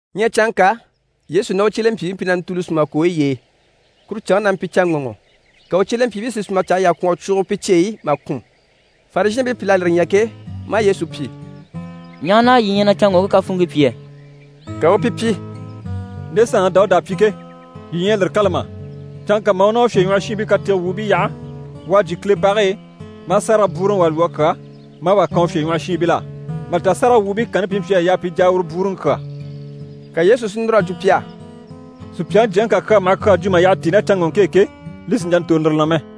Ɲyɛ canŋka, Yesu ná u cyelempyiibii mpyi na ntùuli sùma kooyi y'e. Kuru canŋke na mpyi canŋɔŋɔ. Ka u cyelempyiibii si sùmaɲcahayi yà kwɔ̀n a cwuugo pi cyeyi i mà kùn. Farizhɛɛnbii pìl'à lire ɲya ke, maa Yesu pyi: «Ɲaha na yii ɲyɛ na canŋɔŋke kafuunŋkii pyi yɛ?» Ka u u pi pyi: «Nde saanŋi Dawuda à pyi ke, yii ɲyɛ a lire kâla mà? Canŋka mà u ná u fyèɲwɔhɔshiinbii katege wuubii yaha, u à jyè Kile bage e, maa sárage bwúuruŋi wà lwɔ́ a kyà, maa wà kan u fyèɲwɔhɔshiinbil'á. Mà li ta sáragawwuubii kanni pi mpyi a yaa pi jà a uru bwúuruŋi kyà.» Ka Yesu si núr'a jwo pi á: «Supyaŋi Jyaŋi ká kyaa maha kyaa jwo mà yyaha tíi ná canŋɔŋke e ke, li sì n‑jà n‑tòro lire na mɛ.»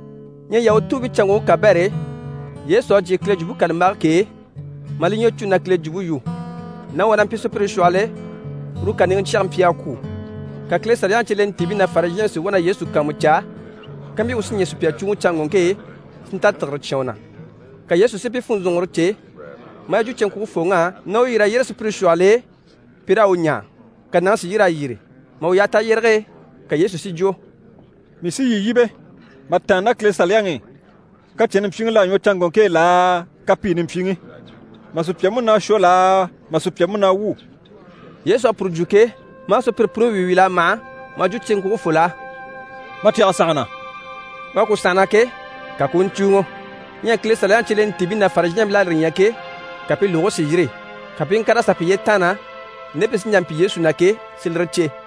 Ɲyɛ Yahutuubiicanŋɔŋke kabɛr'e, Yesu à jyè Kile Jwumpe kàlambage k'e, maa li ɲwɔ cû na Kile jwumpe yu. Nàŋi wà na mpyi sùpyire shwɔhɔl'e, uru kàniŋɛ cyɛge mpyi a kwû. Ka Kile Saliyaŋi cyelentiibii ná Farizhɛɛnbii si wá na Yesu kàanmucaa kampyi u sí ɲɛɛ sùpya cùuŋɔ canŋɔŋke e, si nta tìgire cyán u na. Ka Yesu si pi funzɔnŋɔre cè, maa yi jwo cyeŋkwugefooŋ'á na u yîr'a yyére sùpyire shwɔhɔl'e, pi raa u ɲaa, ka nàŋi si yîr'a yyére. Mà u yaha tayyérege e, ka Yesu si jwo: «Mii sí yii yíbe, mà tàanna ná Kile Saliyaŋi i, kacɛnni mpyiŋi l'à ɲwɔ canŋɔŋke e laa, kapiini mpyiŋi? Mà sùpya múnaa shwɔ laa, mà sùpya múnaa wwû?» Yesu à puru jwo ke, maa sùpyire puni wíi wíl'a mâha, maa jwo cyeŋkwugefol'á: «Ma cyɛge sànhana.» U à ku sànhana ke, ka ku u ɲcùuŋɔ. Ɲyɛ Kile Saliyaŋi cyelentiibii ná Farizhɛɛnbil'à lire ɲya ke, ka pi lùgigii si yîri. Ka pi i ŋkàr'a sà piye taanna, nde pi sí n‑jà n‑pyi Yesu na ke, si lire cè.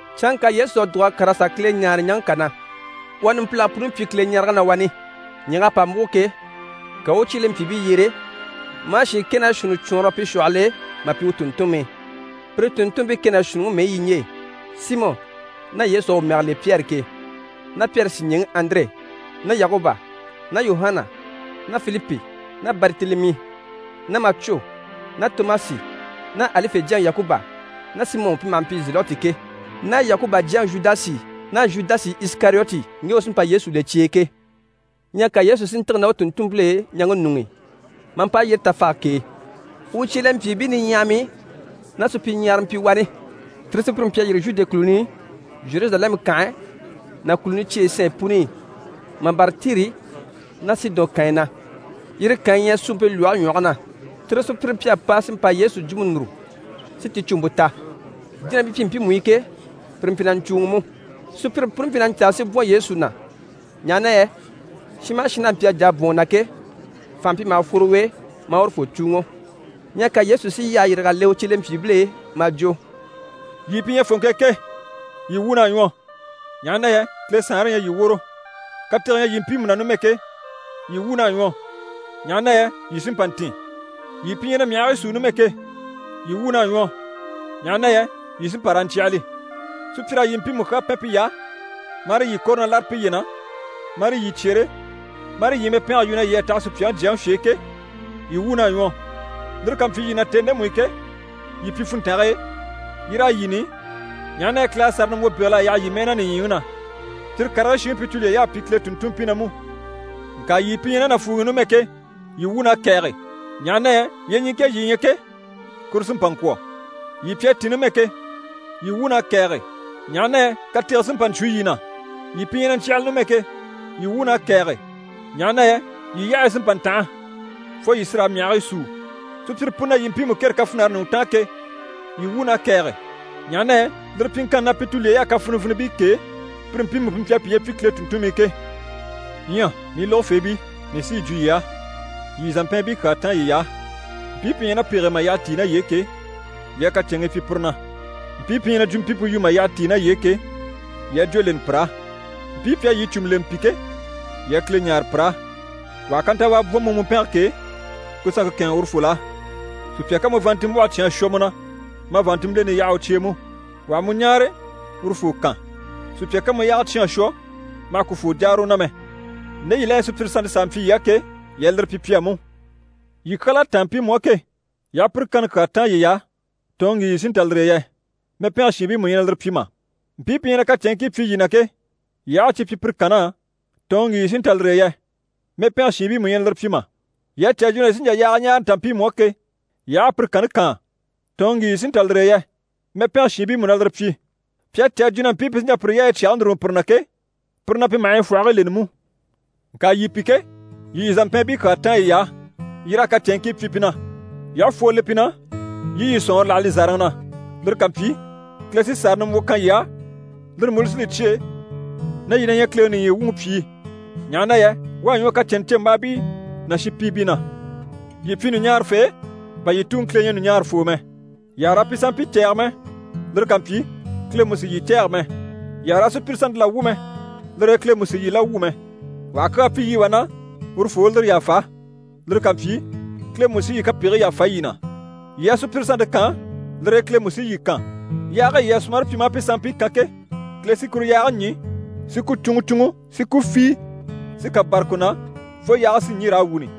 Canŋka Yesu à dùg'a kàr'a sà Kile ɲáare ɲaŋke kà na. U à numpilage puni pyi Kileɲarege na wani. Ɲyɛ̀g'à pa múgo ke, ka u u u cyelempyiibii yyere, maa shiin kɛ ná shuunni cwɔɔnrɔ pi shwɔhɔl'e, mà pyi u tùnntunmii. Pire tùnntunmpii kɛ ná shuunniŋi mɛyi yi ɲje: Simɔ, ná Yesu à u mɛge le Pyɛri ke, ná Pyɛri sìɲɛɛŋi Andire ná Yakuba ná Yuhana ná Filipi ná Baritelemi ná Macwo ná Tomasi ná Alife jyaŋi Yakuba ná Simɔ pi maha mpyi Zelɔti ke, ná Yakuba jyaŋi Zhudasi ná Zhudasi Isikariyoti ŋge u sí n‑pa Yesu le cye e ke. Ɲyɛ ka Yesu si ntîge ná u tùnntunmpil'e ɲaŋke ɲuŋ'i, maa mpa yyére tafage k'e. U cyelempyiibii niɲyahamii ná supyiɲyahara mpyi wani. Tire sùpyire mpyi a yîri Zhude kùluni i, Zheruzalɛmu kànhe ná kùluni cyeyi sanɲyi puni i, mà bâra Tiri ná Sidɔn kànyi na, yire kànyi ɲyɛ suumpe lwɔhe ɲwɔge na. Tire sùpyire mpyi a pa si mpa a Yesu jwumpe núru, si ticuumpe ta. Jínabii mpyi mpiimu i ke, pire mpyi na ɲcùuŋi mú. Sùpyire puni mpyi na ɲcaa si bwɔ̀n Yesu na, ɲaha na yɛ shin maha shin n'a mpyi a jà a bwɔ̀n u na ke, fànha mpyi maha fworo u e, maa urufoo cùuŋɔ. Ɲyɛ ka Yesu si yyahe yîrig'a le u cyelempyiibil'e, maa jwo «Yii pi ɲyɛ fòŋke e ke, yii wuun'à ɲwɔ, ɲaha na yɛ Kile Saanre ɲyɛ yii woro. Katege ɲyɛ yii mpiimu na numɛ ke, yii wuun'à ɲwɔ, ɲaha na yɛ yii sí n‑pa n‑tìn. Yii pi ɲyɛ na myahigii súu numɛ ke, yii wuun'à ɲwɔ, ɲaha na yɛ yii sí n‑pa raa ɲcyàhali. Sùpyir'à yii mpiimu kyaa pɛn piy'á, marii yii kɔ̀re na láre piye na, marii yii cyere, marii yii mɛpɛngɛ yu na yii à taha Supyaŋi Jyaŋi fye e ke, yii wuun'à ɲwɔ. Lire ká mpyi yii na tèni ndemu i ke, yii pyi funntange e, yii raa yini, ɲaha na yɛ Kile à sàra nimbwo bégel'a yaha yii mɛɛ na nìɲyiŋi na. Cyire karigii shiŋi pi tulyey'à pyi Kile tùnntunmpii na mú. Ŋka yii pi ɲyɛ ná nàfuuŋi i numɛ ke, yii wuun'à kɛ̀ɛge, ɲaha na yɛ yyeɲiŋke e yii ɲyɛ ke, kuru sí n‑pa n‑kwɔ̀. Yii pi à tìn numɛ ke, yii wuun'à kɛ̀ɛge, ɲaha na yɛ katege sí n‑pa n‑cwo yii na. Yii pi ɲyɛ na ɲcyàhali numɛ ke, yii wuun'à kɛ̀ɛge, ɲaha na yɛ yii yyahayi sí n‑pa n‑tanha, fo yii sí raa myahigii súu. Sùpyire puni na yii mpiimu kêre kafinare ɲùŋɔ taan ke, yii wuun'à kɛ̀ɛge, ɲaha na yɛ lire pyiŋkanni na, pi tulyey'à kafinivinibii kêe, pire mpiimu pi mpyi a piye pyi Kile tùnntunmii ke. Ɲyɛ mii lógofeebii, mii sí yi jwo yii á: yii yii zàmpɛɛnbii kyaa táan yiy'á. Mpii pi ɲyɛ ná pege e mà yyaha tíi ná yii e ke, yii a kacɛnŋii pyi pire na. Mpii pi ɲyɛ na jwumpimpe yu mà yyaha tíi ná yii e ke, yii a jwó leni pir'á. Mpii pi à yii cùmu lemɛ pi ke, yii a Kile ɲáare pir'á. Wà ha kantawaa bwɔ̀n mu mùmpɛnge k'e, ku sanŋke kɛ̂ɛnŋɛ urufol'á. Sùpya ká mu vàanntinmbwɔhe cyán a shwɔ mu na, ma vàanntinmbileni yaha u cye e mú. Wà ha mu ɲáare, urufoo kan. Sùpya ká mu yaaga cyán a shwɔ, ma hà ku fwoo jáara u na mɛ. Nde yii la ɲyɛ sùpyire sannte s'a mpyi yii á ke, yii a lire pyi pi á mú. Yii kyal'à táan mpiimu á ke, yii aha pire kanni kyaa táan yiy'á, tɔ̀ɔnŋi ŋgi yii sí n‑ta lire e yɛ? Mɛpɛngɛ shiinbii mú ɲyɛ na lire pyi mà? Mpii pi ɲyɛ na kacɛnŋkii pyi yii na ke, yii aha a cyi pyi pire kann'á, tɔ̀ɔnŋi ŋgi yii sí n‑ta lire e yɛ? Mɛpɛngɛ shiinbii mú ɲyɛ na lire pyi mà? Yii à cè a jwo na yii sí n‑jà yaaga ɲáare n‑ta mpiimu á ke, yii aha a pire kanni kaan, tɔ̀ɔnŋi ŋgi yii sí n‑ta lire e yɛ? Mɛpɛngɛ shiinbii mú na lire pyi. Pi à cè a jwo na mpii pi sí n‑jà pire yaayi cyage núruŋɔ pire na ke, pire na pi maha yi fwɔhigii leni mú. Ŋka yii pi ke, yii yii zàmpɛɛnbii kyaa táan yiy'á, yii raa kacɛnŋkii pyi pi na. Yii aha fwoo le pi na, yii i yii sɔ̀nŋɔre láha li zàraŋi na. Lire ká mpyi, Kile sí sàra nimbwo kan yii á, lire mú li sí li cyêe na yii na ɲyɛ Kileŋi nìɲyi wuŋi pyìi, ɲaha na yɛ u à ɲwɔ kacɛnnɛcembaabii ná shinpiibii na. Yii pyi ɲùɲaarafee, bà yii Tuŋi Kile ɲyɛ ɲùɲaarafoo mɛ. Yii àha raa pi sanmpii cɛ̂ɛge mɛ, lire ká mpyi Kile mú sì yii cɛ̂ɛge mɛ. Yii àha raa sùpyire sannte la wwû mɛ, lire e Kile mú sì yii la wwû mɛ. Wà ha kyaa pyi yii wà na, urufoo u lire yàfa. Lire ká mpyi, Kile mú sí yii kapegigii yàfa yii na. Yii a sùpyire sannte kaan, lire e Kile mú sí yii kan, yaage e yii à sumare pyi maa pi sanmpii kan ke, Kile sí kuru yaage ɲî si ku cúnŋɔ cúnŋɔ si ku fíi si kà bâra ku na fo yaage si ɲî raa wuni.»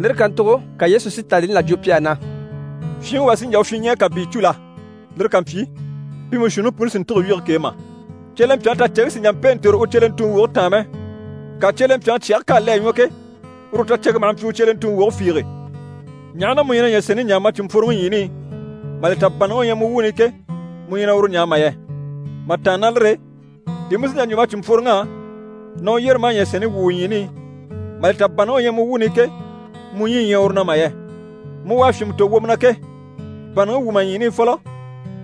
Lire kàntugo ka Yesu si tàanlini là jwo pi á na: «Fyinŋi wà sí n‑jà u fyinɲɛɛ kàbii cû la? Lire ká mpyi, pi mú shuunniŋi puni sì n‑tîge wyige k'e mà? Cyelempyaŋi taceŋke sì n‑jà n‑pêe n‑tòro u cyelentuŋi woge taan mɛ, ŋka cyelempyaŋi cyɛge k'à le a ɲwɔ ke, uru u taceŋke maha mpyi u cyelentuŋi woge fiige. Ɲaha na mu ɲyɛ na ɲyɛ̀sɛnni ɲaa ma cìnmpworoŋi ɲyiini i, mà li ta bànnaŋi u ɲyɛ mu wuuni i ke, mu ɲyɛ na uru ɲaa mà yɛ? Mà tàanna ná lire e, di mu sí n‑jà n‑jwo ma cìnmpworoŋ'á na u yyére maa ɲyɛ̀sɛnni wwû u ɲyiini i, mà li ta bànnaŋi u ɲyɛ mu wuuni i ke, mu ɲyii ɲyɛ uru na mà yɛ? Mu u à fyìnmɛ tò wwomɔ na ke, bànnaŋi wwû ma ɲyiini i fɔlɔ,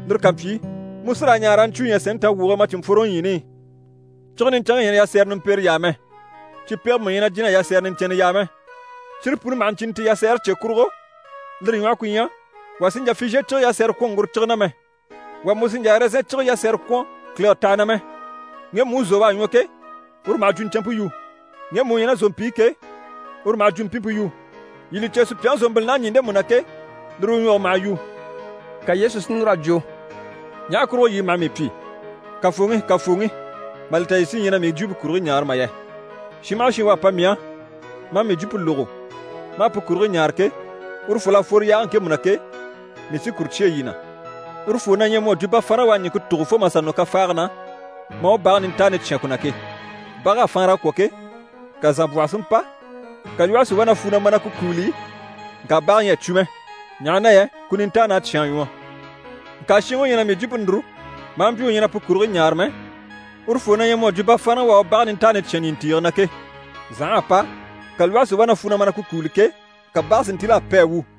lire ká mpyi, mu sí raa ɲaa raa ɲcwúu ɲyɛ̀sɛnni tawwuge e ma cìnmpworoŋi ɲyiini i. Cige niɲcɛnŋke ɲyɛ na yasɛrɛ nimpere yaa mɛ, cipege mú ɲyɛ na jìn'a yasɛrɛ niɲcɛnnɛ yaa mɛ. Cire puni maha ɲcìni ti yasɛɛre cye kurugo, lire ɲwɔhɔ ku ɲyɛ: wà sì n‑jà fizhiye cige yasɛrɛ kwɔ̀n ŋguro cige na mɛ, wà mú sì n‑jà ɛrɛzɛn cige yasɛrɛ kwɔ̀n kìlege taha na mɛ. Ŋgemu u zò u à ɲwɔ ke, uru maha jwuɲcɛnmpe yu. Ŋgemu u ɲyɛ ná zòmpi i ke, uru maha jwumpimpe yu. Yii li cè, sùpyaŋi zòmbilin'à ɲî ndemu na ke, lire u ɲwɔge maha yu.» Ka Yesu si núr'a jwo: «Ɲaha kurugo yii maha mii pyi “Kafooŋi, Kafooŋi” mà li ta yii sí ɲyɛ na mii jwumpe kurigii ɲaare mà yɛ? Shin maha shin u à pa mii á, maa mii jwumpe lógo, maa pu kurigii ɲaare ke, urufol'à fworo yaage ŋkemu na ke, mii sí kuru cyêe yii na. Urufoo na ɲyɛ mu à jwo bafaanraŋi u à ɲìŋke tùgo fo mà sà nɔ kafaage na, maa u bage nintaani cyán ku na ke. Bag'à faanra a kwɔ̀ ke, ka zànbwɔhɔ si mpa, ka lwɔhe si wá na fwu na ma na ku kúuli, ŋka bage ɲyɛ a cwo mɛ, ɲaha na yɛ ku nintaan'à cyán a ɲwɔ. Ŋka shinŋi u ɲyɛ na mii jwumpe núru, maa mpyi u ɲyɛ na pu kurigii ɲaare mɛ, urufoo na ɲyɛ mu à jwo bafaanraŋi u à u bage nintaani cyán ɲìntiige na ke. Zành'à pa, ka lwɔhe si wá na fwu na ma na ku kúuli ke, ka bage si ntíl'a pi a wu.»